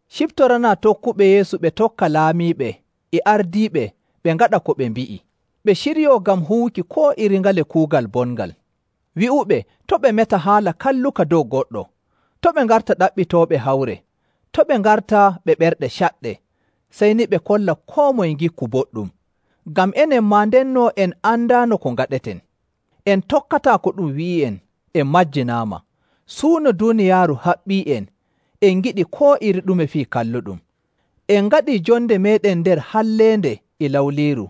Ciftoranaa tokkuɓe Yeesu ɓe tokka laamiiɓe e ardiiɓe ɓe ngaɗa ko ɓe mbi'i, ɓe ciryoo ngam huwuki koo iri ngale kuugal bongal. Wi'uɓe to' ɓe meta haala kalluka dow goɗɗo, to' ɓe ngarta ɗaɓɓitooɓe hawre, to' ɓe ngarta ɓe ɓerɗe caɗɗe. Sey ni ɓe kolla koo moye ngikku boɗɗum. Ngam enen maa ndenno en andaano ko ngaɗeten, en tokkataa ko ɗum wi'i'en, en majjinaama. Suuno duuniyaaru haɓɓii'en, en ngiɗi koo iri ɗume fii kalluɗum. En ngaɗii jonde meeɗen nder halleende e lawliiru,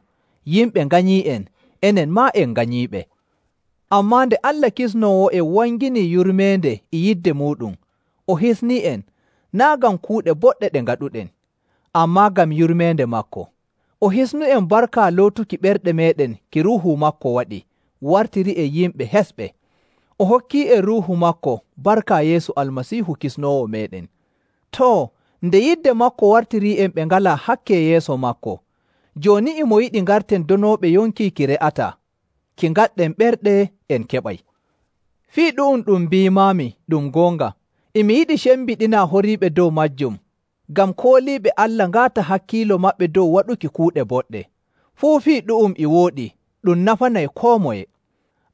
yimɓe nganyii'en, enen maa en nganyiiɓe. Ammaa nde Allah Kisnoowo'en wangini yurmeende e yidde muuɗum, o hisnii'en, naa' ngam kuuɗe boɗɗe ɗe ngaɗuɗen, ammaa ngam yurmeende maako. O hisnu'en barka lootuki ɓerɗe meeɗen ki Ruuhu maako waɗi wartirii'en yimɓe hesɓe. O hokki'en Ruuhu maako barka Yeesu Almasiihu Kisnoowo meeɗen. Too, nde yidde maako wartirii'en ɓe ngalaa hakke yeeso maako, jooni e mo yiɗi ngarten donooɓe yonki ki re'ataa ki ngaɗɗen ɓerɗe en keɓay. Fii ɗu'um ɗum mbiimaami ɗum goonga. E mi yiɗi cembiɗinaa horiiɓe dow maajum ngam kooliiɓe Allah ngaata hakkiilo maɓɓe dow waɗuki kuuɗe boɗɗe. Fuu fii ɗu'um e wooɗi ɗum nafanay koo moye.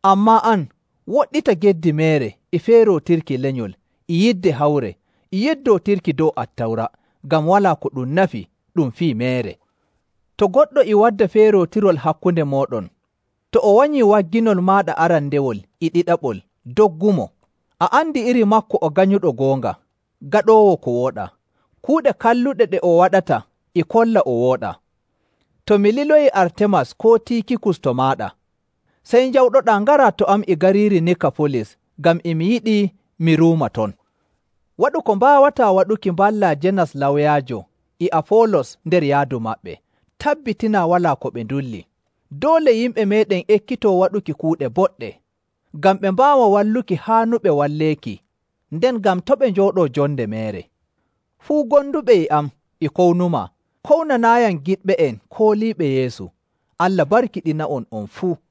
Ammaa an, woɗɗita geddi meere e feerootirki lenyol e yidde hawre e yeddootirki dow Attawra, ngam walaa ko ɗum nafi, ɗum fii meere. To goɗɗo e wadda feerootirol hakkunde mooɗon, to o wanyii wagginol maaɗa arandewol e ɗiɗaɓol, doggumo. A andi iri maako o ganyuɗo goonga, gaɗoowo ko wooɗaa. Kuuɗe kalluɗe ɗe o waɗata e kolla o wooɗaa. To mi liloyii Artemas koo Tiikikus to maaɗa, sey njawɗoɗaa ngaraa to am e gariiri Nikafolis ngam e mi yiɗi mi ruuma ton. Waɗu ko mbaawataa waɗuki mballaa Jenas lawyaajo e Afoolos nder yaadu maɓɓe, tabbitinaa walaa ko ɓe ndulli. Doole yimɓe meeɗen ekkitoo waɗuki kuuɗe boɗɗe, ngam ɓe mbaawa walluki haanuɓe walleeki nden ngam to' ɓe njooɗoo jonde meere. Fuu gonduɓe e am e kownumaa. Kownanaayam giɗɓe'en kooliiɓe Yeesu. Allah barkiɗina'on on fuu.